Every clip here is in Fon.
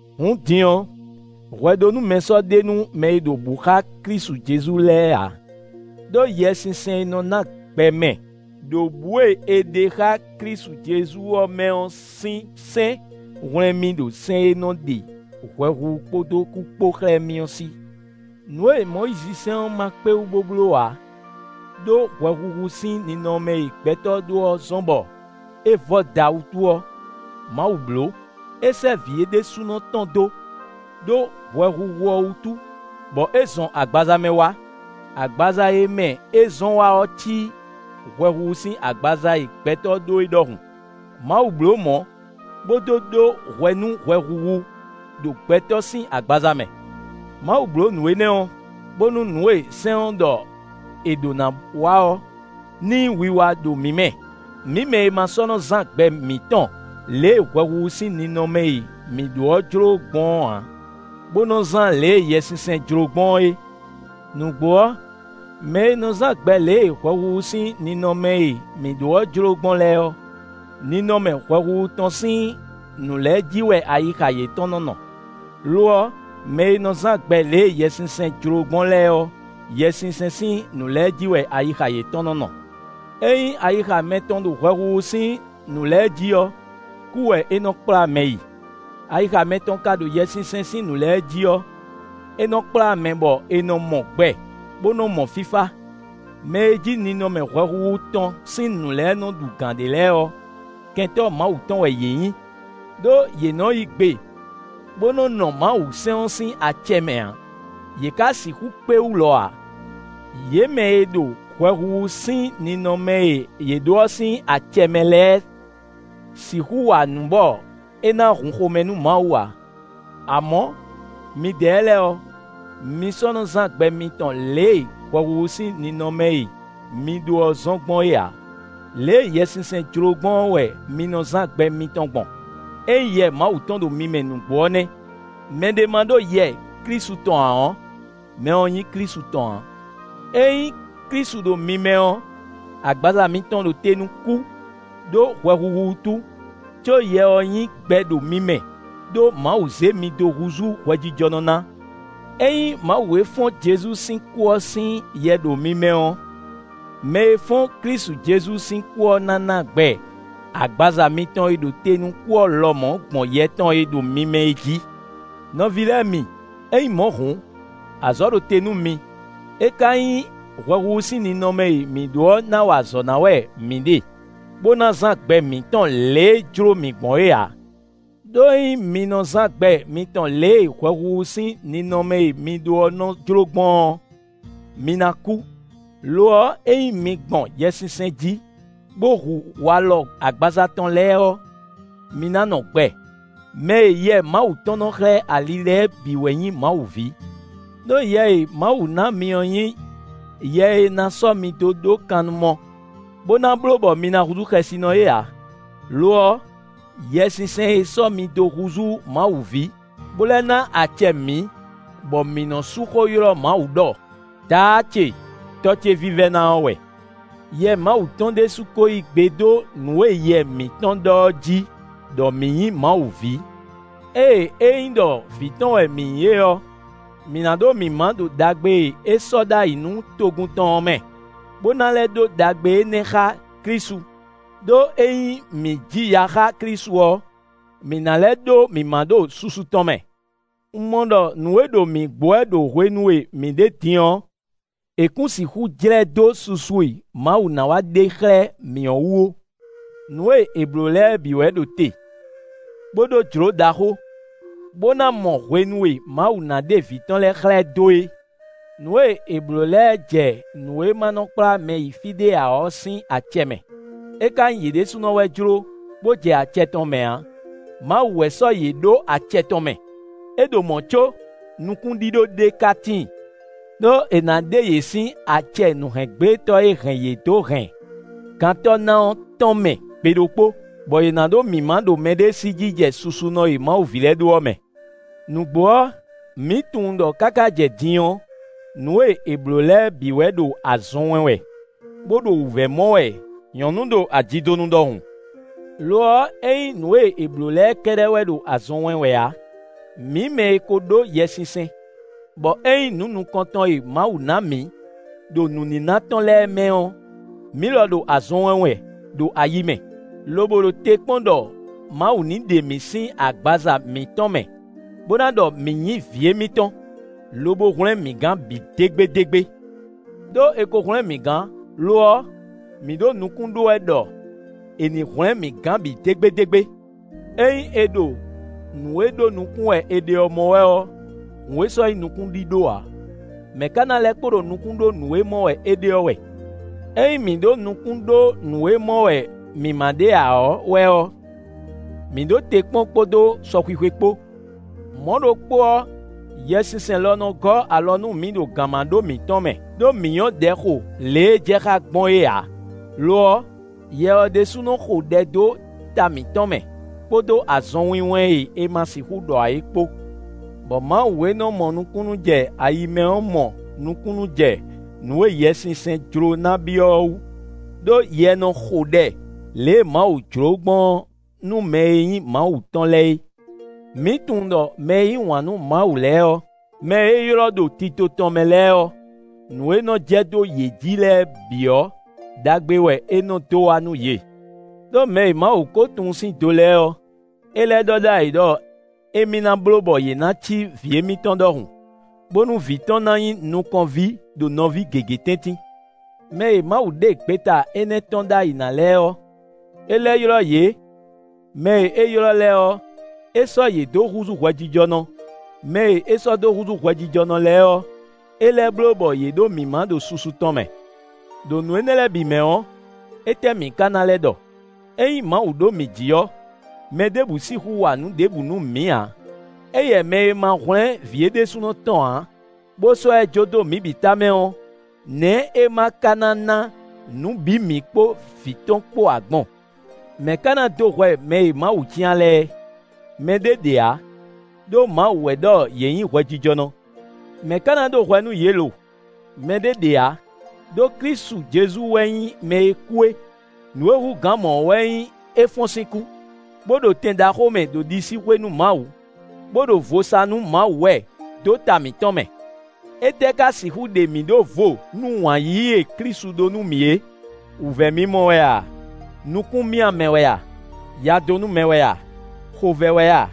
Hǔn din ɔ́, hwɛɖónúmɛ sɔ́ ɖe nú mɛ e ɖo bǔ xá Klísu Jezu lɛ́ɛ ǎ. Đó Yɛsinsɛn e nɔ na gbɛ mɛ, ɖo bǔ e è ɖe xá Klísu Jezu ɔ́ mɛ ɔ́ sín sɛ́n hwlɛ́n mì ɖo sɛ́n e nɔ ɖe hwɛhuhu kpódó kú kpó xlɛ́ mì ɔ́ sí. Nǔ e Mɔyízisɛ́n ɔ́ ma kpé wú bó bló ǎ ɖó hwɛhuhu sín ninɔmɛ e gbɛtɔ́ ɖó ɔ́ zɔ́n bɔ é vɔ́da wútu ɔ́, Mawu bló: é sɛ́ Vǐ é ɖésúnɔ tɔn dó, ɖó hwɛhuhu ɔ́ wútu, bɔ é zɔn agbaza mɛ wá; agbaza e mɛ é zɔn wá ɔ́ cí hwɛhuhu sín agbaza e gbɛtɔ́ ɖó é ɖɔhun. Mawu bló mɔ̌, bó dó ɖó hwɛ nú hwɛhuhu ɖo gbɛtɔ́ sín agbaza mɛ. Mawu bló nǔ énɛ́ ɔ́, bónú nǔ e sɛ́n ɔ́ ɖɔ è ɖǒ na wa ɔ́, ní nyí wiwa ɖo mǐ mɛ; mǐ mɛ e ma sɔ́ nɔ zán gbɛ mǐtɔn lě e hwɛhuhu sín ninɔmɛ e mǐ ɖó ɔ́ jló gbɔn ɔ́ ǎ, bó nɔ zán lě e Yɛsinsɛn jló gbɔn é. Nǔgbó ɔ́, mɛ e nɔ zán gbɛ lě e hwɛhuhu sín ninɔmɛ e mǐ ɖó ɔ́ jló gbɔn lɛ́ɛ ɔ́, ninɔmɛ hwɛhuhu tɔn sín nǔ lɛ́ɛ jí wɛ ayixa yětɔn nɔ́ nɔ; lo ɔ́, mɛ e nɔ zán gbɛ lě e Yɛsinsɛn jló gbɔn lɛ́ɛ ɔ́, Yɛsinsɛn sín nǔ lɛ́ɛ jí wɛ ayixa yětɔn nɔ́ nɔ. Ényí ayixa mɛtɔn ɖo hwɛhuhu sín nǔ lɛ́ɛ jí ɔ́, kú wɛ é nɔ kplá mɛ yi; ayixa mɛtɔn ka ɖo Yɛsinsɛn sín nǔ lɛ́ɛ jí ɔ́, é nɔ kplá mɛ bɔ è nɔ mɔ gbɛ, bó nɔ mɔ fífá. Mɛ e jí ninɔmɛ hwɛhuhu tɔn sín nǔ lɛ́ɛ nɔ ɖu gǎn ɖe lɛ́ɛ ɔ́, kɛntɔ́ Mawu tɔn wɛ yě nyǐ; ɖó yě nɔ yí gbe bó nɔ́ nɔ Mawusɛ́n ɔ́ sín acɛ mɛ ǎ; yě ka sixú kpé wú lɔ ǎ. Yě mɛ e ɖo hwɛhuhu sín ninɔmɛ e yě ɖǒ ɔ́ sín acɛ mɛ lɛ́ɛ sixú wa nǔ bɔ é ná hun xomɛ nú Mawu ǎ. Amɔ̌, midɛɛ lɛ́ɛ ɔ́, mi sɔ́ nɔ zán gbɛ mitɔn lě e hwɛhuhu sín ninɔmɛ e mi ɖó ɔ́ zɔ́n gbɔn é ǎ; lě e Yɛsinsɛn jló gbɔn ɔ́ wɛ mi nɔ zán gbɛ mitɔn gbɔn; ényí Yɛ Mawu tɔn ɖo mi mɛ nǔgbó ɔ́ nɛ́. Mɛ ɖé ma ɖó Yɛ Klísu tɔn ǎ ɔ́, mɛ ɔ́ nyí Klísu tɔn ǎ. Ényí Klísu ɖo mi mɛ ɔ́, agbaza mitɔn ɖo te nú kú, ɖó hwɛhuhu wútu; có Yɛ ɔ́ nyí gbɛ ɖo mi mɛ ɖó Mawu zé mi dó húzú hwɛjijɔnɔ ná. Ényí Mawu e fɔ́n Jezu sín kú ɔ́ sín Yɛ ɖo mi mɛ ɔ́, mɛ e fɔ́n Klísu Jezu sín kú ɔ́ ná ná gbɛ agbaza mitɔn e ɖo te nú kú ɔ́ lɔmɔ̌ gbɔn Yɛ tɔn e ɖo mi mɛ é jí. Nɔví lɛ́ɛ mi! Ényí mɔ̌ hǔn, azɔ̌ ɖo te nú mi; é ka nyí hwɛhuhu sín ninɔmɛ e mǐ ɖó ɔ́ na wa azɔ̌ ná wɛ mǐ ɖe, bó ná zán gbɛ mǐtɔn lě e é jló mǐ gbɔn é ǎ. Đó ényí mi nɔ zán gbɛ mitɔn lě e hwɛhuhu sín ninɔmɛ e mi ɖo ɔ́ nɔ jló gbɔn ɔ́, mi ná kú. Lo ɔ́, ényí mi gbɔn Yɛsinsɛn jí bó hu walɔ agbaza tɔn lɛ́ɛ ɔ́, mi ná nɔ gbɛ. Mɛ e Yɛ Mawu tɔn nɔ́ xlɛ́ ali lɛ́ɛ bǐ wɛ nyí Mawu ví. Đó Yɛ e Mawu na mi ɔ́ nyí, yɛ e na sɔ́ mi dó ɖó kannumɔ, bó ná bló bɔ mi na húzú xɛsinɔ é ǎ. Lo ɔ́, Yɛsinsɛn e sɔ́ mi dó húzú Mawu ví, bó lɛ́ ná acɛ mǐ, bɔ mi nɔ sú xó ylɔ́ Mawu ɖɔ: “Daá ce! Tɔ́ ce vívɛ́ná” ɔ́ wɛ. Yɛ Mawu tɔn ɖésú ko yí gbe dó nǔ e yɛ mǐtɔn ɖɔ ɔ́ jí ɖɔ mǐ nyǐ Mawu ví. Ée é nyí ɖɔ vǐ tɔn wɛ mǐ nyí é ɔ́, mǐ ná ɖó mǐmá ɖo ɖagbe e é sɔ́ ɖ'ayǐ nú togun tɔn ɔ́ mɛ, bó ná lɛ́ ɖó ɖagbe énɛ́ xá Klísu. Đó ényí mǐ ji ya xá Klísu ɔ́, mǐ ná lɛ́ ɖó mǐmá ɖo susu tɔn mɛ. Un mɔ ɖɔ nǔ e ɖo mǐ gbo wɛ ɖo hwenu e mǐ ɖe din ɔ́, è kún sixú jlɛ́ dó susu e Mawu ná wá ɖe xlɛ́ mǐ ɔ́ wú ó. Nǔ e è blǒ lɛ́ɛ bǐ wɛ ɖo te, bó ɖó jló ɖaxó, bó ná mɔ hwenu e Mawu ná ɖe vǐ tɔn lɛ́ɛ xlɛ́ dó é. Nǔ e è blǒ lɛ́ɛ jɛ nǔ e ma nɔ kplá mɛ yi fí ɖé ǎ ɔ́ sín acɛ mɛ; é ka nyí yě ɖésúnɔ wɛ jló, bó jɛ acɛ tɔn mɛ ǎ; Mawu wɛ sɔ́ yě ɖó acɛ tɔn mɛ; é ɖo mɔ̌ có nukúnɖíɖó ɖé ka tíin. Đó è nǎ ɖe yě sín acɛ nǔhɛngblétɔ́ e hɛn yě dó hɛn gantɔ́ ná ɔ́ tɔn mɛ gbe ɖokpó, bɔ yě ná ɖó mǐmá ɖo mɛɖée sí jijɛ susunɔ e Mawu ví lɛ́ɛ ɖó ɔ́ mɛ. Nǔgbó ɔ́, mǐ tunwun ɖɔ káká jɛ din ɔ́, nǔ e è blǒ lɛ́ɛ bǐ wɛ ɖo azɔn wɛn wɛ, bó ɖo wǔvɛ́ mɔ wɛ nyɔ̌nu ɖo ajidonu ɖɔhun. Lo ɔ́, é nyí nǔ e è blǒ lɛ́ɛ kɛ́ɖɛ́ wɛ ɖo azɔn wɛn wɛ ǎ, mǐ mɛ e ko ɖó Yɛsinsɛn, bɔ é nyí nǔ nukɔntɔn e Mawu ná mǐ, ɖo nǔníná tɔn lɛ́ɛ mɛ ɔ́, mǐ lɔ ɖo azɔn wɛn wɛ ɖo ayi mɛ, lobo ɖo te kpɔ́n ɖɔ Mawu ní ɖe mǐ sín agbaza mǐtɔn mɛ, bó ná ɖɔ mǐ nyí vǐ émítɔn, lobo hwlɛ́n mǐ gan bǐ dégbédégbé. Đó è ko hwlɛ́n mǐ gán; lo ɔ́, mǐ ɖo nukún ɖó wɛ ɖɔ è ní hwlɛ́n mǐ gán bǐ dégbédégbé. Ényí è ɖo nǔ e ɖó nukún wɛ è ɖe ɔ́ mɔ wɛ ɔ́, hǔn é sɔ́ nyí nukúnɖíɖó ǎ; mɛ̌ ka ná lɛ́ kpo ɖo nukún ɖó nǔ e mɔ wɛ é ɖe ɔ́ wɛ? Ényí mǐ ɖo nukún ɖó nǔ e mɔ wɛ mǐ ma ɖe ǎ ɔ́ wɛ ɔ́, mǐ ɖo te kpɔ́n kpódó sɔxwixwe kpó. Mɔ̌ ɖokpó ɔ́, Yɛsinsɛn lɔ nɔ gɔ́ alɔ nú mǐ ɖo gǎnmaɖó mǐtɔn mɛ, ɖó mǐ nyɔ́ ɖɛ xo lě e é jɛ xá gbɔn é ǎ; lo ɔ́, Yɛ ɔ́ ɖésú nɔ xo ɖɛ dó ta mǐtɔn mɛ kpódó azɔnwinwɛn e è ma sixú ɖɔ ǎ é kpó. Bɔ Mawu e nɔ mɔ nukúnnú jɛ ayi mɛ ɔ́ mɔ nukúnnú jɛ nǔ e Yɛsinsɛn jló ná byɔ́ ɔ́ wú, ɖó Yɛ nɔ xo ɖɛ lě e Mawu jló gbɔn ɔ́ nú mɛ e nyí Mawu tɔn lɛ́ɛ é. Mǐ tunwun ɖɔ mɛ e yí wǎn nú Mawu lɛ́ɛ ɔ́, mɛ e é ylɔ́ ɖo tito tɔn mɛ lɛ́ɛ ɔ́, nǔ e nɔ jɛ dó yě jǐ lɛ́ɛ bǐ ɔ́, ɖagbe wɛ é nɔ dó wá nú yě. Đó mɛ e Mawu ko tunwun sín do lɛ́ɛ ɔ́, é lɛ́ ɖɔ ɖ'ayǐ ɖɔ émí na bló bɔ yě ná cí Vǐ émítɔn ɖɔhun, bónú vǐ tɔn ná nyí nukɔn ví ɖo nɔví gěgé tɛ́ntin. Mɛ e Mawu ɖe gbeta énɛ́ tɔ́n ɖ'ayǐ ná lɛ́ɛ ɔ́, é lɛ́ ylɔ́ yě; mɛ e é ylɔ́ lɛ́ɛ ɔ́, é sɔ́ yě dó húzú hwɛjijɔnɔ; mɛ e é sɔ́ dó húzú hwɛjijɔnɔ lɛ́ɛ ɔ́, é lɛ́ bló bɔ yě ɖó mǐmá ɖo susu tɔn mɛ. Đo nǔ énɛ́ lɛ́ɛ bǐ mɛ ɔ́, étɛ́ mǐ ka na lɛ́ ɖɔ? Ényí Mawu ɖo mǐ jí ɔ́, mɛ ɖěbǔ sixú wa nǔ ɖěbǔ nú mǐ ǎ. Éyɛ́ mɛ e ma hwlɛ́n Vǐ é ɖésúnɔ tɔn ǎ, bó sɔ́ ɛ jó dó mǐ bǐ tamɛ ɔ́, nɛ̌ é ma ka ná ná nǔ bǐ mǐ kpó Vǐ tɔn kpó ǎ gbɔn? Mɛ̌ ka ná dó hwɛ mɛ e Mawu cyán lɛ́ɛ? Mɛ ɖé ɖe ǎ, ɖó Mawu wɛ ɖɔ yě nyǐ hwɛjijɔnɔ. Mɛ̌ ka ná ɖó hwɛ nú yě lo? Mɛ ɖé ɖe ǎ, ɖó Klísu Jezu wɛ nyí mɛ e kú é; nǔ e hú gǎn mɔ̌ ɔ́ wɛ nyí é fɔ́n sín kú, bó ɖo tɛn ɖaxó mɛ ɖo ɖisíxwé nú Mawu, bó ɖo vo sa nú Mawu wɛ dó ta mǐtɔn mɛ. Étɛ́ ka sixú ɖe mǐ ɖó vo nú wǎn yíyí e Klísu ɖó nú mǐ é? Wǔvɛ́mimɔ wɛ a, nukúnmyámɛ wɛ a, yadónúmɛ wɛ a, xovɛ́ wɛ a,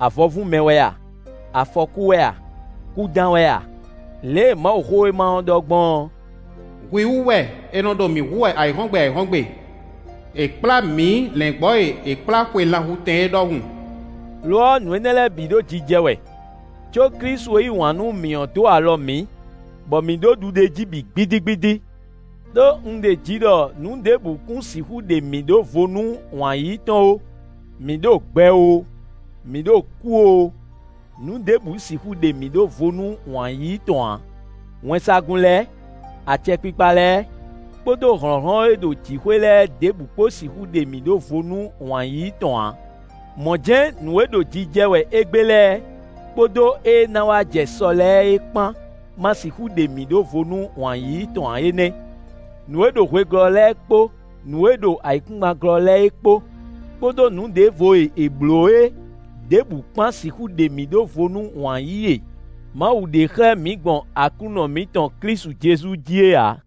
avɔvúnmɛ wɛ a, afɔkú wɛ a, kúdán wɛ a? Lě e Mawuxówéma ɔ́ ɖɔ gbɔn ɔ́: “Hwi wú wɛ è nɔ ɖo mǐ hu wɛ ayǐhɔ́ngbe ayǐhɔ́ngbe; è kplá mǐ lɛ̌ngbɔ́ e è kplá xwe lanhutɛn é ɖɔhun.” Lo ɔ́, nǔ énɛ́ lɛ́ɛ bǐ ɖo jijɛ wɛ, có Klísu e yí wǎn nú mǐ ɔ́ dó alɔ mǐ, bɔ mǐ ɖó ɖuɖéjí bǐ gbídígbídí. Đó un ɖeji ɖɔ nǔ ɖěbǔ kún sixú ɖe mǐ ɖó vo nú wǎn yíyí tɔn ó: mǐ ɖo gbɛ oo, mǐ ɖo kú oo, nǔ ɖěbǔ sixú ɖe mǐ ɖó vo nú wǎn yíyí tɔn ǎ; wɛnsagun lɛ́ɛ, acɛkpikpa lɛ́ɛ, kpódó hlɔ̌nhlɔ́n e ɖo jǐxwé lɛ́ɛ ɖěbǔ kpó sixú ɖe mǐ ɖó vo nú wǎn yíyí tɔn ǎ; mɔ̌ jɛ́n nǔ e ɖo jijɛ wɛ égbé lɛ́ɛ, kpódó éé ná wá jɛ sɔ lɛ́ɛ é kpán ma sixú ɖe mǐ ɖó vo nú wǎn yíyí tɔn ǎ é nɛ́. Nǔ e ɖo hwe glɔ́ lɛ́ɛ kpó nǔ e ɖo ayǐkúngban glɔ́ lɛ́ɛ é kpó, kpódó nǔ ɖěvo e è blǒ é ɖěbǔ kpán sixú ɖe mǐ ɖó vo nú wǎn yíyí e Mawu ɖe xlɛ́ mǐ gbɔn Aklúnɔ mǐtɔn Klísu Jezu jí é ǎ.